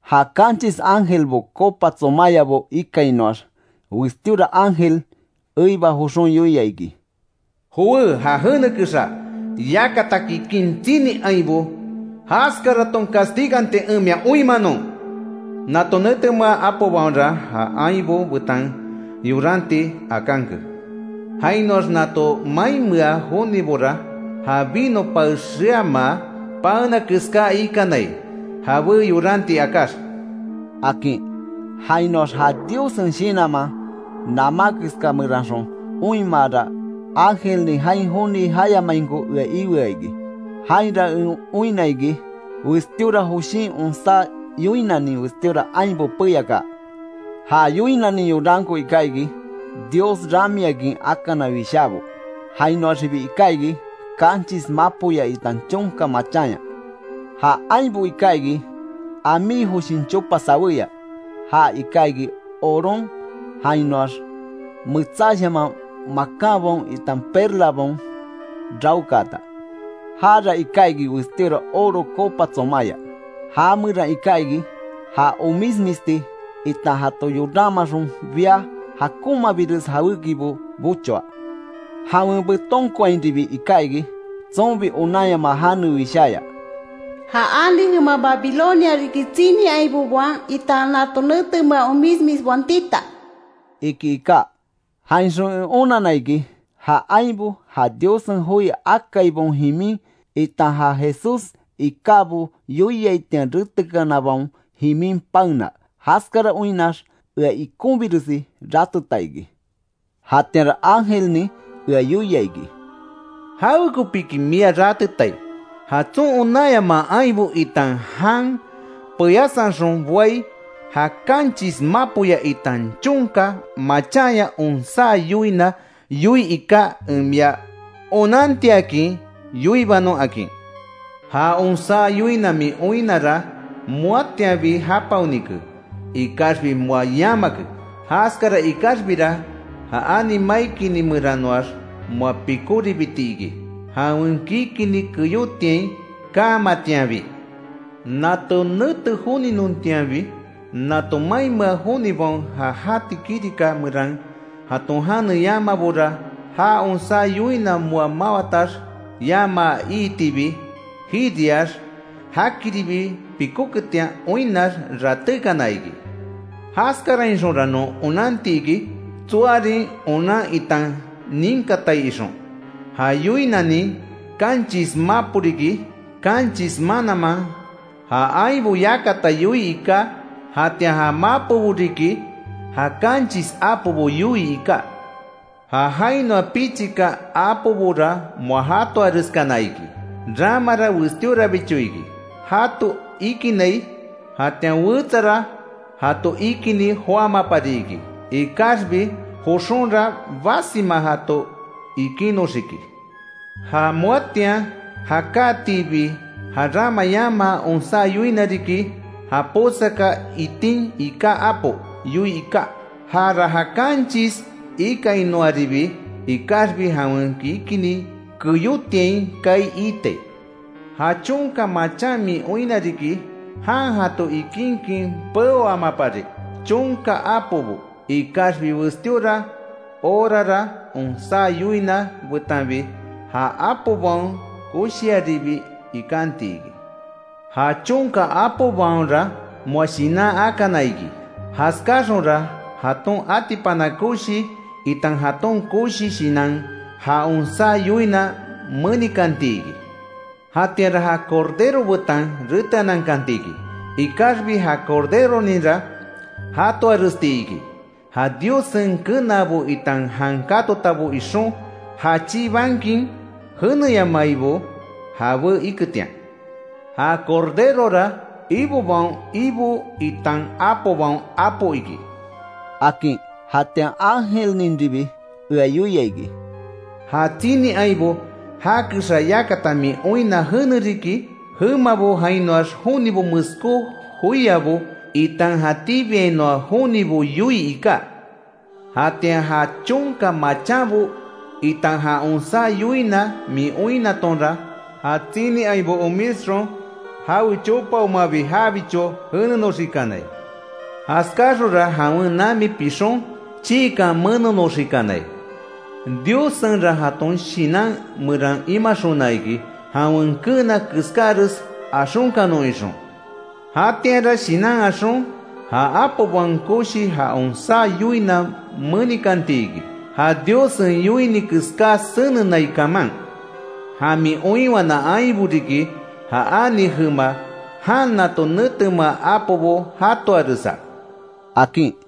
Ja kanchis ángelbo copa tsomáyabo ikainoax, westíora ángel eiba joxon yoia iki: “Jowé ja jene kexa yakata kikin tsini ainbo jaskaraton castiganti en mia oinmanon. Nato netemea apobaonra ja ainbo betan yoranti akanke. Jainoax nato mainmea jonibora ja vino pae xeamaa paena keská ikanai jabé yoranti akáx”, akin. Jainoax ja Diossen Shinanman namá keska meranxon oinmaara, ángelnin jain joni jayamainko ea ioa iki. Jainra en oinna iki, westíora joshin onsá yoinanin westíora ainbo peyakaa. Ja yoinanin yoranko iká iki Dios ramiakin akana wishábo. Jainoaxibi iká iki, kanchis mapoya, itan chonka machanya. Ja ainbo iká iki amí joshin chopa sawéya, ja iká iki oron, jainoax metsáshaman makanbaon, itan perlabaon raokaata. Jara iká iki westíora oro copa tsomaya, ja meran iká iki, ja omismisti, itan jato yoranmaxon bia jakonmabires jawékibo bochoa. Jawen betonkoainribi iká iki, tsonbi onanyamaa jane wisháya: “Ja ani jema Babilonia riki tsini ainbobaon, itan nato netemea omismisbaon tita”, iki iká. Jainxon en onanna iki, ja ainbo ja Diossen joi akaibaon jimin, itan ja Jesús ikábo yoiaitian retekanabaon jimin paena. Jaskara oinnax ea ikonbiresi rateta iki. Jatianra ángelnin ea yoia iki: “¿Jawekopiki mia ratetai? Ja tson onanyamaa ainbo, itan jan peyasanxon boai, ja kanchis mapoya, itan chonka machanya onsá yoina yoii iká en mia onantiakin yoibanon akin. Ja onsá yoina min oinnara moatianbi japaonike, ikaxbi moa yamake; jaskara ikaxbira, ja ani mai kini meranoax moa pikóribiti iki, jawen kikini keyotiain kaamatianbi. Nato nete joninontianbi nato mainmea jonibaon ja jati kirika meran jaton jane yamaabora, ja onsá yoina moa mawatax yamaa iitibi; jiriax jakiribi pikóketian oinnax ratékana iki. Jaskarainxonra non onanti iki, tsoarin onan itan ninkatai ixon. Ja yoinanin kanchis mapo riki; kanchis mananman, ja ainbo yakata yoii iká, jatian ja mapobo riki, ja kanchis apobo yoii iká. Ja jainoa pichika apobora moa jatoareskana iki, ramara westíorabicho iki, jato ikinai. Jatian wetsara jato ikinni joámapari iki. Ikaxbi joxonra basima jato ikinoxiki. Ja moatian jakátiibi ja rama yamaa onsá yoina riki, ja posaka itin iká apo yoii iká. Jara ja kanchis ikainoaribi ikaxbi, jawen kikini keyotiain kaai iitai. Ja chonka machan min oinna riki, jan jato ikinkin peoamapari chonka apobo. Ikaxbi westíora horara onsá yoina betanbi, ja apobaon koshiaribi ikanti iki. Ja chonka apobaonra moa shinan akana iki. Jaskáxonra, jaton atipana koshi, itan jaton koshi shinan ja onsá yoina menikanti iki. Jatianra ja Cordero betan reteanankanti iki, ikaxbi ja Corderoninra jatoaresti iki, ja Diossen kenaabo itan jan katotabo ixon já chibankin jeneyamaibo jabé iketian. Ja Corderora, ibobaon Ibo itan apobaon Apo iki”, akin. Jatian ángelninribi ea yoia iki: “Ja tsini ainbo, ja kexa, yakata min oinna jene riki, jemabo jainoax jonibo, meskó joiabo, itan jatíbiainoa jonibo yoii iká. Jatian ja chonka machanbo, itan ja onsá yoina min oinnatonra, ja tsini ainbo omisxon jawe chopaomabi jabicho jenenoxikanai. Jaskáxonra jawen nami pixon chiikan menonoxikanai. Diossenra jaton shinan meran imaxona iki, jawen keena keskáres axonkanon ixon. Jatianra shinan axon, ja apobaon koshi ja onsá yoina menikanti iki, ja Diossen yoini keská senenai kaman. Ja min oinwana ainbo riki, ja ani jema, jan nato netemea apobo jatoaresa”, akin.